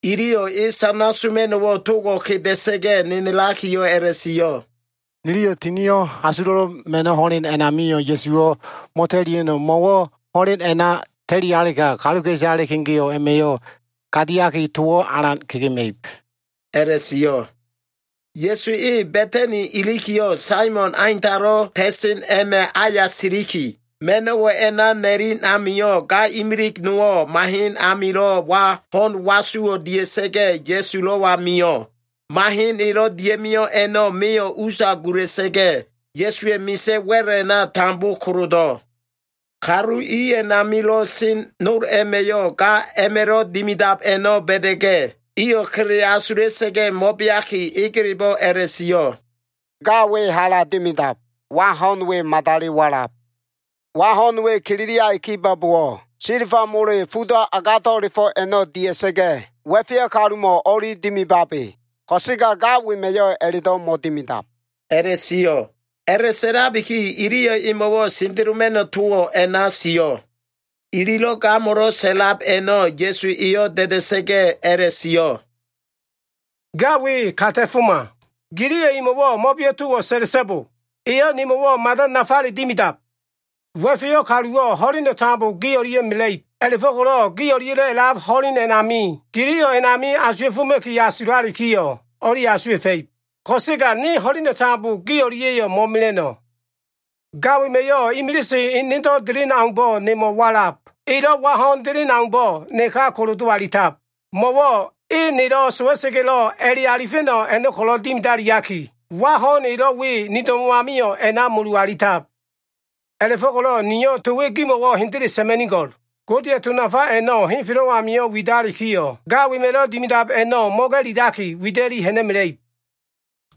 Iliyo꞉ e sana soma꞉no꞉wo꞉ togo꞉ kedesa꞉ga꞉ nenelakiyo꞉ a꞉la꞉sio꞉, “Niliyo꞉ Tinio꞉ Asulo꞉lo꞉ Ma꞉no꞉ ho꞉len a꞉namio꞉ Ya꞉su mo꞉ta꞉lia꞉no꞉, mo꞉wo꞉ ho꞉len a꞉na ta꞉lialega, kaluka꞉isale kegeo꞉ a꞉ma꞉yo꞉ gadiaki, towo꞉ alan kegema꞉ib,” a꞉la꞉sio꞉. Ya꞉su e Ba꞉tani ilikiyo꞉, Saimon Aintalo꞉ ta꞉sen a꞉ma꞉ aya siliki, ma꞉no꞉wo꞉ a꞉na na꞉len ami, ga imilig nowo꞉ mahen amilo꞉ wa ho꞉n wasuwo꞉ dia꞉sa꞉ga꞉, Ya꞉sulo꞉wa mio꞉. Mahen elo꞉ dia꞉mio꞉ a꞉no꞉ meyo꞉ usa gula꞉sa꞉ga꞉, Ya꞉suwa꞉ misa꞉ wa꞉l a꞉na tambo kolodo꞉. Kalu i a꞉namilo꞉ sen nol a꞉ma꞉yo꞉ ga a꞉ma꞉lo꞉ dimidab a꞉no꞉ ba꞉da꞉ga꞉, iyo꞉ kele asula꞉sa꞉ga꞉ mo꞉beaki, egelebo꞉ a꞉la꞉sio꞉, “Ga we hala dimidab. Wa ho꞉n we madali walab. Wa ho꞉n we kililiai kibo꞉bowo꞉, silba mole fudo꞉ agado꞉la꞉fo꞉ a꞉no꞉ dia꞉sa꞉ga꞉, wa꞉feyo꞉ kalumo꞉ o꞉li dimibabe. Ko꞉sega ga wema꞉yo꞉ a꞉la꞉do꞉ mo꞉dimidab” a꞉la꞉sio꞉. A꞉la꞉asulabiki, iliyo꞉ emo꞉wo꞉ sendeloma꞉no꞉ towo꞉ a꞉na sio꞉. Ililo꞉ gamo꞉lo꞉ sa꞉lab a꞉no꞉ Ya꞉su eyo꞉ da꞉da꞉sa꞉ga꞉ a꞉la꞉sio꞉, “Ga we ka ta꞉foma. Giliyo꞉ emo꞉wo꞉ mo꞉beo꞉ towo꞉ sa꞉la꞉so꞉bo! Eyo꞉ nemo꞉wo꞉ mada nafale dimidab. Wa꞉feyo꞉ kaluwo꞉ ho꞉len tambo gi o꞉lia꞉ mela꞉ib. A꞉la꞉fo꞉ko꞉lo꞉ gi o꞉lia꞉lo꞉ a꞉lab ho꞉len a꞉nami, giliyo꞉ a꞉namio꞉ asuwa꞉foma꞉ki asulalikiyo꞉, o꞉li asuwa꞉fa꞉ib. Ko꞉sega ne ho꞉leno꞉ tambo gi o꞉lia꞉yo꞉ mo꞉mela꞉no꞉. Ga wema꞉yo꞉ imilise enedo꞉ delen aumbo꞉ nemo꞉ walab. Elo꞉ wa ho꞉n delen aumbo꞉ neka kolodo꞉ alitab. Mo꞉wo꞉ e nelo꞉ sowa꞉sa꞉ga꞉lo꞉ a꞉le alifa꞉no꞉ a꞉no꞉ ko꞉lo꞉ dimidaliaki, wa ho꞉n elo꞉ we ni do꞉mo꞉ amio꞉ a꞉na mulu alitab. A꞉la꞉fo꞉ko꞉lo꞉ niyo꞉ to we gimo꞉wo꞉ hendele sa꞉ma꞉nigo꞉l. Godeya꞉ to nafa a꞉no꞉ henfelo꞉ amio꞉ widalikiyo꞉, ga wema꞉lo꞉ dimidab a꞉no꞉ mo꞉ga꞉lilaki, wida꞉li ha꞉na꞉mela꞉ib,”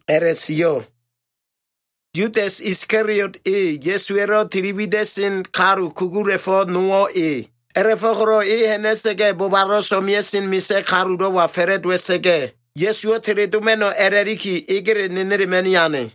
a꞉la꞉sio꞉. Yudas Iskaliot e, Ya꞉suwa꞉lo꞉ tili wida꞉sen kalu kugula꞉fo꞉ nowo꞉ e. A꞉la꞉fo꞉ko꞉lo꞉ e ha꞉na꞉sa꞉ga꞉ bobalo꞉ so꞉mea꞉sen misa꞉ kalulo꞉wa fa꞉la꞉dowa꞉sa꞉ga꞉, Ya꞉suwo꞉ teledoma꞉no꞉ a꞉la꞉liki egele nenelema꞉ni ane.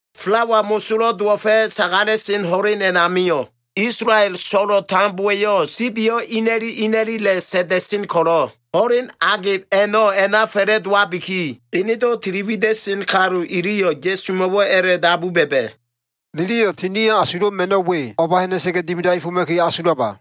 Falawa Mosolo꞉ Dowo꞉fa꞉ sagala꞉sen ho꞉len a꞉namio꞉, Isolael so꞉lo꞉ tambowa꞉yo꞉ sibiyo꞉ ina꞉li ina꞉lila꞉ sa꞉nda꞉sen ko꞉lo꞉, ho꞉len agelo꞉ a꞉na fa꞉la꞉dowabiki, enedo꞉ tili wida꞉sen kalu iliyo꞉ Ya꞉sumo꞉wo꞉ a꞉la꞉dabu ba꞉ba꞉, “Niliyo꞉ Tinio꞉ Asulo꞉ Ma꞉no꞉ we o꞉ba ha꞉na꞉sa꞉ga꞉ dimidaefoma꞉ki asulaba?”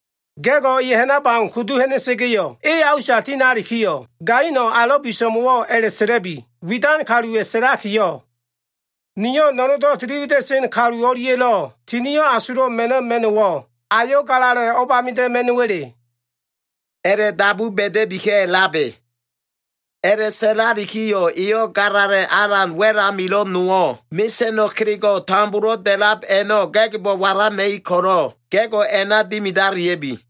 Ga꞉go꞉ e ha꞉nab au kudu ha꞉na꞉sa꞉ga꞉yo꞉, e a usa tinalikiyo꞉, gaino꞉ alo꞉ biso꞉mo꞉wo꞉ a꞉la꞉sa꞉la꞉bi, ‘Widan Kaluwa꞉ sa꞉lakiyo꞉, “Niyo꞉ no꞉no꞉ndo꞉ tili wida꞉sen kalu o꞉lia꞉lo꞉ Tinio꞉ Asulo꞉ Ma꞉no꞉ ma꞉no꞉wo꞉ ayo꞉ galala꞉ o꞉bamida꞉ ma꞉no꞉wa꞉le?” ’ a꞉la꞉dabu ba꞉da꞉bika꞉labe. A꞉la꞉sa꞉lalikiyo꞉, eyo꞉ galala꞉ alan wa꞉l amilo꞉ nowo꞉, mesa꞉no꞉ kelego꞉wo꞉ tambolo꞉ da꞉lab a꞉no꞉ ga꞉gbo꞉ walama꞉ib ko꞉lo꞉, ga꞉go꞉ a꞉na dimidalia꞉bi.”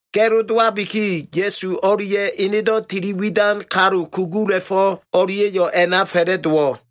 Ga꞉lo dowabiki, Ya꞉su o꞉lia꞉ enedo꞉ tili widan kalu kugula꞉fo꞉ o꞉lia꞉yo꞉ a꞉na fa꞉la꞉dowo꞉.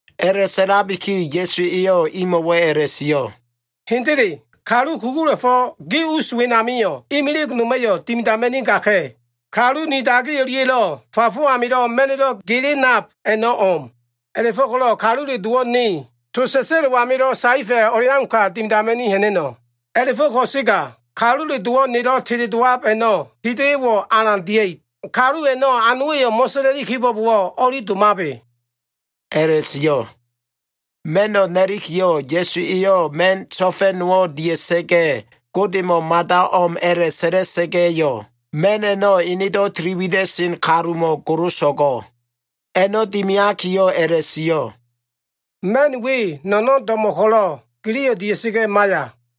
A꞉la꞉sa꞉labiki Ya꞉su eyo꞉ imo꞉wo꞉ a꞉la꞉sio꞉, “Hendele kalu kugula꞉fo꞉ gi us wenamio꞉ imilig noma꞉yo꞉ dimidama꞉nigaka꞉. Kalu ni dagi o꞉lia꞉lo꞉ fafo amilo꞉ ma꞉no꞉lo꞉ gele nab a꞉no꞉ o꞉m. A꞉la꞉fo꞉ko꞉lo꞉ Kalule Dowo꞉ ne, to sa꞉sa꞉lo꞉ amilo꞉ saefa꞉ o꞉leauka dimidama꞉ni ha꞉na꞉no꞉. A꞉la꞉fo꞉ ko꞉sega, Kalule Dowo꞉ nelo꞉ teledowab a꞉no꞉ hida꞉yo꞉wo꞉ alan dia꞉ib. Kalu a꞉no꞉ anowa꞉yo꞉ mo꞉sa꞉la꞉li kibo꞉bowo꞉, o꞉li domabe” a꞉la꞉sio꞉. Ma꞉no꞉ na꞉likiyo꞉, Ya꞉su eyo꞉ ma꞉n so꞉fa꞉ nowo꞉ dia꞉sa꞉ga꞉, Godemo꞉ mada o꞉m a꞉la꞉sa꞉la꞉sa꞉ga꞉yo꞉, ma꞉n a꞉no꞉ enedo꞉ tili wida꞉sen kalumo꞉ goloso꞉go꞉. A꞉no꞉ dimiakiyo꞉ a꞉la꞉sio꞉, “Ma꞉n we no꞉no꞉n do꞉mo꞉ ko꞉lo꞉, giliyo꞉ dia꞉sa꞉ga꞉ maiya.”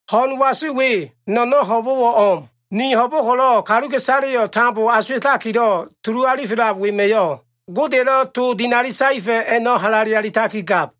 “Ho꞉n wasu we, no꞉no꞉n ho꞉bo꞉wo꞉ o꞉m. Ni ho꞉bo꞉ ko꞉lo꞉ kaluka꞉isaleyo꞉ tambo asuwa꞉takilo꞉ tulu alifelab wema꞉yo꞉ Godeya꞉lo꞉ to dinali saefa꞉ a꞉no꞉ halale alitakigab.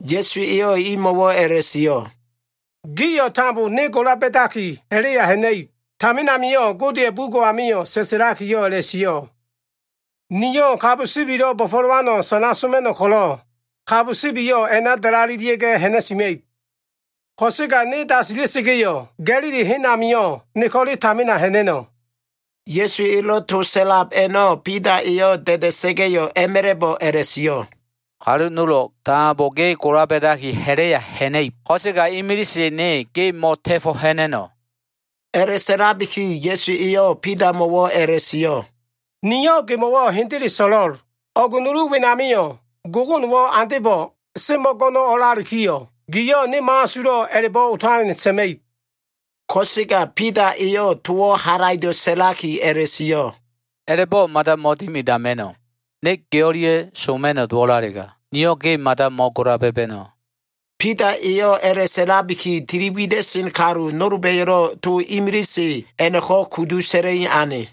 Ya꞉su eyo꞉ imo꞉wo꞉ a꞉la꞉sio꞉, “Gio꞉ tambo ne gola ba꞉daki ha꞉la꞉ya ha꞉na꞉ib. Tamin amio꞉ Godeya꞉ bugo꞉ amio꞉ sa꞉sa꞉lakiyo꞉ a꞉la꞉sio꞉, “ ‘Niyo꞉ sibilo꞉ bo꞉fo꞉lowano꞉ sana soma꞉no꞉ ko꞉lo꞉, kabo sibiyo꞉ a꞉na dalalelia꞉ga꞉ ha꞉na꞉sima꞉ib.’ Ko꞉sega ne dasila꞉sa꞉ga꞉yo꞉, Ga꞉lili hen amio꞉ ne ko꞉le tamina ha꞉na꞉no꞉.” Ya꞉su elo꞉ to sa꞉lab a꞉no꞉, Bida eyo꞉ da꞉da꞉sa꞉ga꞉yo꞉ a꞉ma꞉la꞉bo꞉ a꞉la꞉sio꞉, “Kalu nolo꞉ tambo ge gola ba꞉daki ha꞉la꞉ya ha꞉na꞉ib, ko꞉sega imilise ne ge mo꞉ta꞉fo꞉ ha꞉na꞉no꞉.” A꞉la꞉sa꞉labiki Ya꞉su eyo꞉ Bidamo꞉wo꞉ a꞉la꞉sio꞉, “Niyo꞉ gemo꞉wo꞉ hendele so꞉lo꞉l. O꞉g nulu wenamio꞉, gogonowo꞉ andebo꞉ semo꞉ go꞉no꞉ o꞉lalikiyo꞉, giyo꞉ ne mo꞉asulo꞉ a꞉la꞉bo꞉ otalen sa꞉ma꞉ib.” Ko꞉sega Bida eyo꞉ towo꞉ halaido꞉ sa꞉laki a꞉la꞉sio꞉, “A꞉la꞉bo꞉ mada mo꞉dimidama꞉no꞉. Ne ge o꞉lia꞉ soma꞉no꞉ dowo꞉lalega, niyo꞉ ge mada mo꞉gola ba꞉ba꞉no꞉.” Bida eyo꞉ a꞉la꞉sa꞉labiki, tili wida꞉sen kalu nolba꞉yo꞉lo꞉ to imilise a꞉no꞉ko꞉ kudu sa꞉la꞉i ane.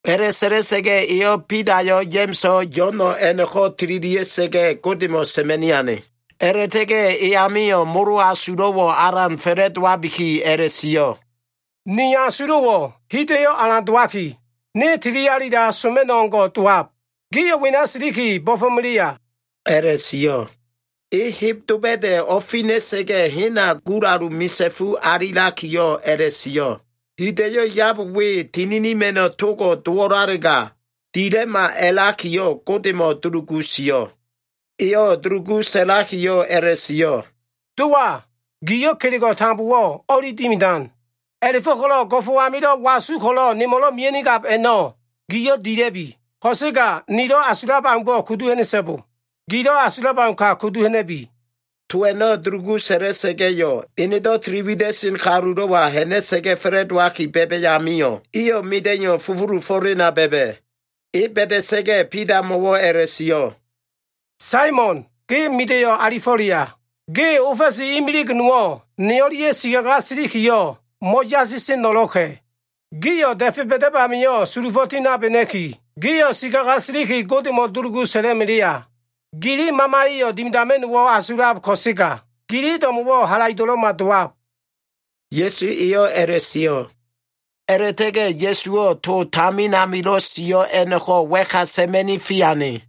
A꞉la꞉sa꞉la꞉sa꞉ga꞉ eyo꞉ Bidayo꞉, Ya꞉ma꞉so꞉, Yo꞉no꞉ a꞉no꞉ko꞉ tililia꞉sa꞉ga꞉, Godemo꞉ sa꞉ma꞉ni ane, a꞉la꞉ta꞉ga꞉ e amio꞉ molo asulo꞉wo꞉ alan fa꞉la꞉dowabiki a꞉la꞉sio꞉, “Ni asulo꞉wo꞉ hida꞉yo꞉ alan dowaki, ne tilialila soma꞉no꞉ o꞉ngo꞉ dowab. Gio꞉ wena siliki bo꞉fo꞉melea” a꞉la꞉sio꞉. E heb doba꞉da꞉ o꞉fina꞉sa꞉ga꞉, hena gulalu misa꞉fu alilakiyo꞉ a꞉la꞉sio꞉, hida꞉yo꞉ yab we tininima꞉no꞉ togo꞉ dowo꞉lalega dila꞉ma a꞉lakiyo꞉ Godemo꞉ dulugu sio꞉. Eyo꞉ dulugu sa꞉lakiyo꞉ a꞉la꞉sio꞉, “Dowa, giyo꞉ kelego꞉ tambowo꞉ o꞉li dimidan. A꞉la꞉fo꞉ko꞉lo꞉ go꞉fo꞉ amilo꞉ wasu ko꞉lo꞉ nemo꞉lo꞉ mea꞉nigab a꞉no꞉ giyo꞉ dila꞉bi. Ko꞉sega nilo꞉ asulab aumbo꞉ kudu ha꞉na꞉so꞉bo. Gilo꞉ asulab auka kudu ha꞉na꞉bi.” To a꞉no꞉ dulugu sa꞉la꞉sa꞉ga꞉yo꞉, enedo꞉ tili wida꞉sen kalulo꞉wa ha꞉na꞉sa꞉ga꞉ fa꞉la꞉dowaki ba꞉ba꞉ amio꞉, iyo꞉ mida꞉iyo꞉ fufulufo꞉lena ba꞉ba꞉. E ba꞉da꞉sa꞉ga꞉, Bidamo꞉wo꞉ a꞉la꞉sio꞉, “Saimon, ge mida꞉iyo꞉ alifo꞉leya? Ge ofa꞉si imilig nowo꞉ ne o꞉lia꞉ sikaga silikiyo꞉ mo꞉yasiseno꞉lo꞉ka꞉. Gio꞉ da꞉fe ba꞉dab amio꞉ sulufo꞉ tinabena꞉ki, gio꞉ sikaga siliki, Godemo꞉ dulugu sa꞉la꞉ melea. Gili mamaya꞉yo꞉ dimidama꞉no꞉wo꞉ asulab ko꞉sega, gili do꞉mo꞉wo꞉ halaido꞉lo꞉ma dowab,” Ya꞉su eyo꞉ a꞉la꞉sio꞉. A꞉la꞉ta꞉ga꞉ Ya꞉suwo꞉ to tamin amilo꞉ sio꞉ a꞉no꞉ko꞉ wa꞉ka sa꞉ma꞉ni fiane.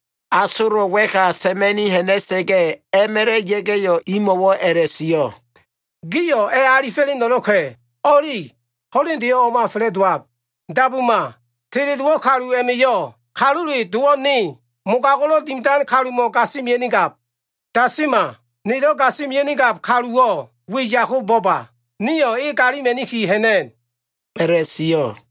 Asolo꞉ wa꞉ka sa꞉ma꞉ ha꞉na꞉sa꞉ga꞉, a꞉ma꞉la꞉ ya꞉ga꞉yo꞉, imo꞉wo꞉ a꞉la꞉sio꞉, “Gio꞉ a꞉ alifo꞉leno꞉lo꞉ka꞉! O꞉li. Ho꞉lendeyo꞉ o꞉ma fa꞉la꞉dowab. Dabuma, teledowo꞉ kalu a꞉ma꞉yo꞉ Kalule Dowo꞉ ne, mogago꞉lo꞉ dimidan kalumo꞉ gasimia꞉nigab. Dasima! Nelo꞉ gasimia꞉nigab kaluwo꞉ weyako bo꞉ba. Nio꞉ e galima꞉niki ha꞉na꞉n” a꞉la꞉sio꞉.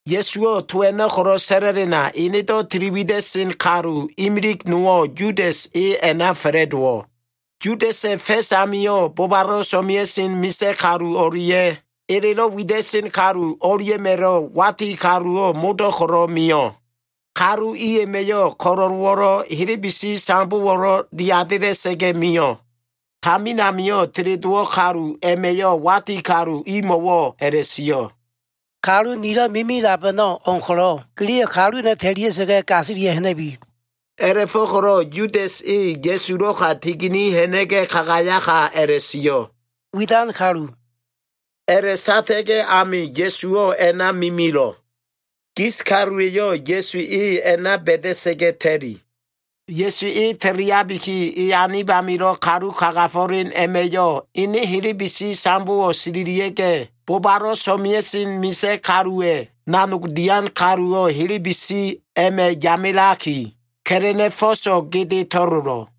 Ya꞉suwo꞉ to a꞉no꞉ ko꞉lo꞉ sa꞉la꞉lena, enedo꞉ tiliwida꞉sen kalu imilig nowo꞉ Yudas, e a꞉na fa꞉la꞉dowo꞉. Yudasa꞉ fa꞉s amio꞉, bobalo꞉ so꞉mea꞉sen misa꞉ kalu o꞉lia꞉ elelo꞉ wida꞉sen kalu o꞉lia꞉ma꞉lo꞉ wati kaluwo꞉ modo꞉ ko꞉lo꞉ mio꞉. Kalu i a꞉ma꞉yo꞉ ko꞉lo꞉lowo꞉lo꞉, helebesi sambowo꞉lo꞉ diadela꞉sa꞉ga꞉ mio꞉. Tamin amio꞉ teledowo꞉ kalu a꞉ma꞉yo꞉ wati kalu imo꞉wo꞉ a꞉la꞉sio꞉, “Kalu nilo꞉ mimilab a꞉no꞉ o꞉m ko꞉lo꞉, giliyo꞉ kalu a꞉no꞉ ta꞉lia꞉sa꞉ga꞉, gasili ha꞉na꞉bi.” A꞉la꞉fo꞉ko꞉lo꞉ Yudas e Ya꞉sulo꞉ka tigini ha꞉na꞉ga꞉ kagayaka a꞉la꞉sio꞉, “Widan kalu.” A꞉la꞉sata꞉ga꞉ ami Ya꞉suwo꞉ a꞉na mimilo꞉. Gis kaluwa꞉yo꞉ Ya꞉su e a꞉na ba꞉da꞉sa꞉ga꞉ ta꞉li. Ya꞉su e ta꞉liabiki, e anib amilo꞉ kalu kagafo꞉len a꞉ma꞉yo꞉, ene helebesi sambowo꞉ sililia꞉ga꞉, bobalo꞉ so꞉mea꞉sen misa꞉ kaluwa꞉ nanog dian kaluwo꞉ helebesi a꞉ma꞉ yamelaki, ka꞉la꞉na꞉ fo꞉so꞉ gede to꞉lolo꞉.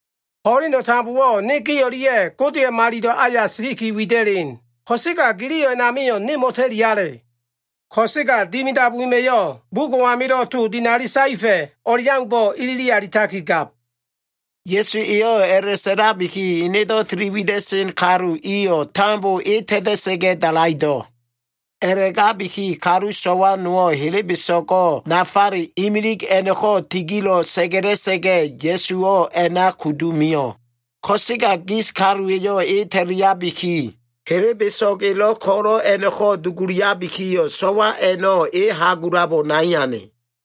Ho꞉leno꞉ tambowo꞉ ne gi o꞉lia꞉ Godeya꞉ Malilo꞉ aya siliki wida꞉len, ko꞉sega giliyo꞉ a꞉namio꞉ ne mo꞉ta꞉liale. Ko꞉sega dimidab wema꞉yo꞉ bugo꞉ amilo꞉ to dinali saefa꞉ o꞉leaumbo꞉ ilili alitakigab.” Ya꞉su eyo꞉ a꞉la꞉sa꞉labiki, enedo꞉ tili wida꞉sen kalu iyo꞉ tambo e ta꞉ta꞉sa꞉ga꞉ dalaido꞉. A꞉la꞉gabiki kalu so꞉wa nowo꞉ helebeso꞉go꞉ nafale imilig a꞉no꞉ko꞉ tigilo꞉ sa꞉ga꞉la꞉sa꞉ga꞉, Ya꞉suwo꞉ a꞉na kudu mio꞉. Ko꞉sega gis kaluwa꞉yo꞉ e ta꞉liabiki, helebeso꞉g elo꞉ ko꞉lo꞉ a꞉no꞉ko꞉ duguliabikiyo꞉, so꞉wa a꞉no꞉ e hagulabo nai ane.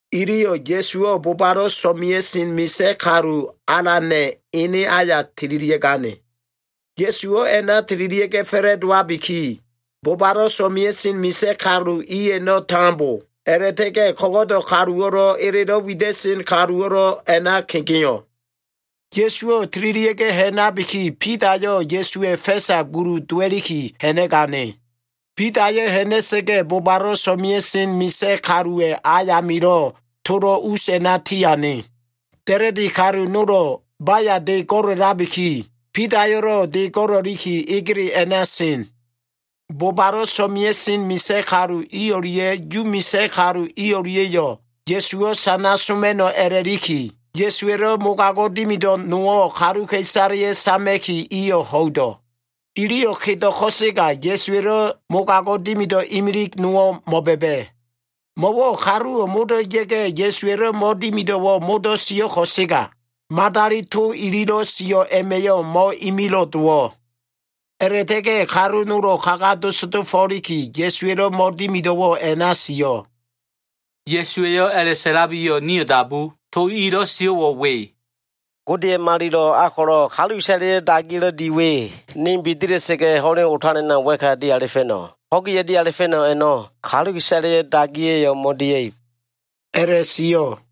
Iliyo꞉ Ya꞉suwo꞉ bobalo꞉ so꞉mea꞉sen misa꞉ kalu alana꞉ ene aya tililia꞉gane. Ya꞉suwo꞉ a꞉na tililia꞉ga꞉ fa꞉la꞉dowabiki, bobalo꞉ so꞉mea꞉sen misa꞉ kalu i a꞉no꞉ tambo, a꞉la꞉ta꞉ga꞉ ko꞉go꞉do꞉ kaluwo꞉lo꞉, elelo꞉ wida꞉sen kaluwo꞉lo꞉, a꞉na kegeo꞉. Ya꞉suwo꞉ tililia꞉ga꞉ ha꞉nabiki, Bidayo꞉ Ya꞉suwa꞉ fa꞉sa gulu dowa꞉liki ha꞉na꞉gane. Bidayo꞉ ha꞉na꞉sa꞉ga꞉, bobalo꞉ so꞉mea꞉sen misa꞉ kaluwa꞉ ayamilo꞉ tolo꞉ us a꞉na tiane. Da꞉la꞉di kalu nolo꞉ baya de go꞉la꞉labiki, Bidayo꞉lo꞉ de go꞉la꞉liki, egele a꞉na sen. Bobalo꞉ so꞉mea꞉sen misa꞉ kalu i o꞉lia꞉ Yu misa꞉ kalu i o꞉lia꞉yo꞉ Ya꞉suwo꞉ sana soma꞉no꞉ a꞉la꞉liki, Ya꞉suwa꞉lo꞉ mogago꞉ dimido꞉ nowo꞉ kaluka꞉isaleyo꞉ sama꞉ki, iyo꞉ ho꞉ido꞉. Iliyo꞉ kedo꞉ ko꞉sega, Ya꞉suwa꞉lo꞉ mogago꞉ dimido꞉ imilig nowo꞉ mo꞉ba꞉ba꞉. Mo꞉wo꞉ kaluwo꞉ modo꞉ ya꞉ga꞉, Ya꞉suwa꞉lo꞉ mo꞉dimido꞉wo꞉ sio꞉ ko꞉sega, madali to ililo꞉ sio꞉ a꞉ma꞉yo꞉ mo꞉imilo꞉ dowo꞉. A꞉la꞉ta꞉ga꞉ kalu nolo꞉ kaga dosdofo꞉liki, Ya꞉suwa꞉lo꞉ mo꞉dimido꞉wo꞉ a꞉na sio꞉. Ya꞉su eyo꞉ a꞉la꞉sa꞉labikiyo꞉, nio꞉ dabu. To elo꞉ sio꞉wo꞉ we, “Godeya꞉ malilo꞉ a ko꞉lo꞉ kaluka꞉isaleya꞉ dagiya꞉lo꞉ di we, ne bidila꞉sa꞉ga꞉, ho꞉len o꞉talena wa꞉ka dialifa꞉no꞉. Ho꞉gi a꞉dialifa꞉no꞉ a꞉no꞉, kaluka꞉isaleya꞉ dagiya꞉yo꞉ mo꞉dia꞉ib” a꞉la꞉sio꞉.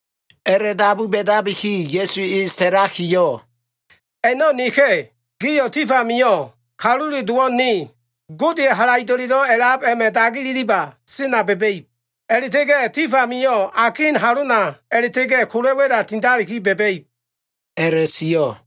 A꞉la꞉dabu ba꞉dabiki, Ya꞉su e sa꞉lakiyo꞉, “A꞉no꞉ neka꞉! Gio꞉ tif amio꞉ Kalule Dowo꞉ ne, Gode Halaido꞉lelo꞉ a꞉lab a꞉ma꞉ dagi ililiba sena ba꞉ba꞉ib. A꞉la꞉ta꞉ga꞉ tif amio꞉ akin halona a꞉la꞉ta꞉ga꞉ kola꞉ wa꞉la tindaliki ba꞉ba꞉ib” a꞉la꞉sio꞉.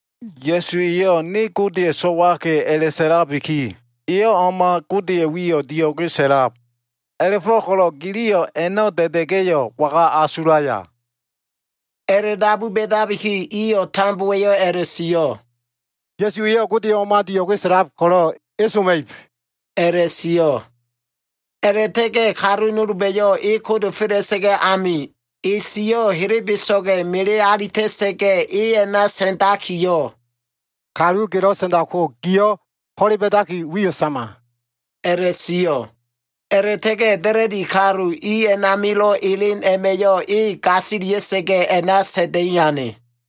Ya꞉su eyo꞉, ‘ne Godeya꞉ So꞉waka꞉’ a꞉la꞉sa꞉labiki, eyo꞉ o꞉ma Godeya꞉ wiyo꞉ dio꞉ge sa꞉lab. A꞉la꞉fo꞉ko꞉lo꞉ giliyo꞉ a꞉no꞉ da꞉da꞉ga꞉yo꞉ waga asulaya?” A꞉la꞉dabu ba꞉dabiki, iyo꞉ tambowa꞉yo꞉ a꞉la꞉sio꞉, “Ya꞉su eyo꞉ Godeyo꞉ o꞉ma dio꞉ge sa꞉lab ko꞉lo꞉ e soma꞉ib” a꞉la꞉sio꞉. A꞉la꞉ta꞉ga꞉ kalu nolba꞉yo꞉ e kodofela꞉sa꞉ga꞉ ami, e siyo꞉ helebeso꞉ga꞉ mele alita꞉sa꞉ga꞉, e a꞉na sa꞉ndakiyo꞉, “Kalu gelo꞉ sa꞉ndabko giyo꞉ ho꞉le ba꞉daki wiyo꞉ sama” a꞉la꞉sio꞉. A꞉la꞉ta꞉ga꞉ da꞉la꞉di kalu i a꞉namilo꞉ elen a꞉ma꞉yo꞉ e gasilia꞉sa꞉ga꞉ a꞉na sa꞉nda꞉i ane.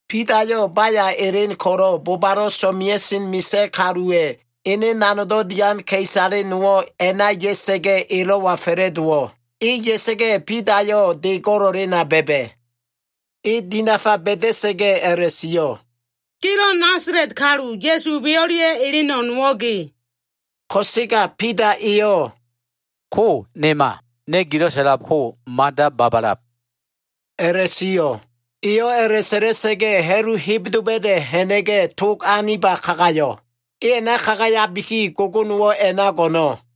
Bidayo꞉ baya elen ko꞉lo꞉, bobalo꞉ so꞉mea꞉sen misa꞉ kaluwa꞉ ene nanogdo꞉ dian ka꞉isale nowo꞉ a꞉na ya꞉sa꞉ga꞉, elo꞉wa fa꞉la꞉dowo꞉. E ya꞉sa꞉ga꞉, Bidayo꞉ de go꞉la꞉lena ba꞉ba꞉. E dinafa ba꞉da꞉sa꞉ga꞉ a꞉la꞉sio꞉, “Gelo꞉ Nasala꞉t kalu, Ya꞉su we o꞉lia꞉lo꞉ eleno꞉ nowo꞉ ge.” Ko꞉sega Bida eyo꞉, “Ko nema. Ne gilo꞉ sa꞉labko mada babalab” a꞉la꞉sio꞉. Eyo꞉ a꞉la꞉sa꞉la꞉sa꞉ga꞉, ha꞉lu heb doba꞉da꞉ ha꞉na꞉ga꞉, tog aniba kagayo꞉. E a꞉na kagayabiki, gogonowo꞉ a꞉na go꞉no꞉.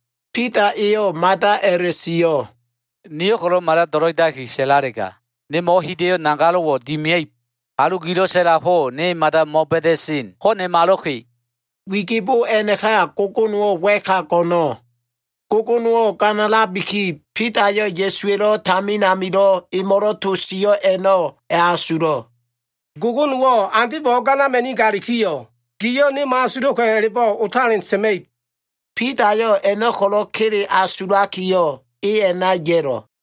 Bida eyo꞉ mada a꞉la꞉sio꞉, “Niyo꞉ ko꞉lo꞉ mada do꞉lo꞉idaki sa꞉lalega, nemo꞉wo꞉ hida꞉yo꞉ nagalo꞉wo꞉ dimia꞉ib. Kalu gilo꞉ sa꞉labko, ne mada mo꞉ba꞉da꞉sen. Ko nemalo꞉ka꞉!” Wigibo a꞉naka, gogonowo꞉ wa꞉ka go꞉no꞉. Gogonowo꞉ ganalabiki, Bidayo꞉ Ya꞉suwa꞉lo꞉ tamin amilo꞉ emo꞉lo꞉ to sio꞉ a꞉no꞉ a꞉asulo꞉, “Gogonowo꞉ andebo꞉ o꞉ganama꞉nigalikiyo꞉, giyo꞉ ne mo꞉asulo꞉ka꞉ a꞉la꞉bo꞉ otalen sa꞉ma꞉ib” a꞉la꞉sio꞉. Bidayo꞉ a꞉no꞉ ko꞉lo꞉ kele asulakiyo꞉, e a꞉na ya꞉lo꞉.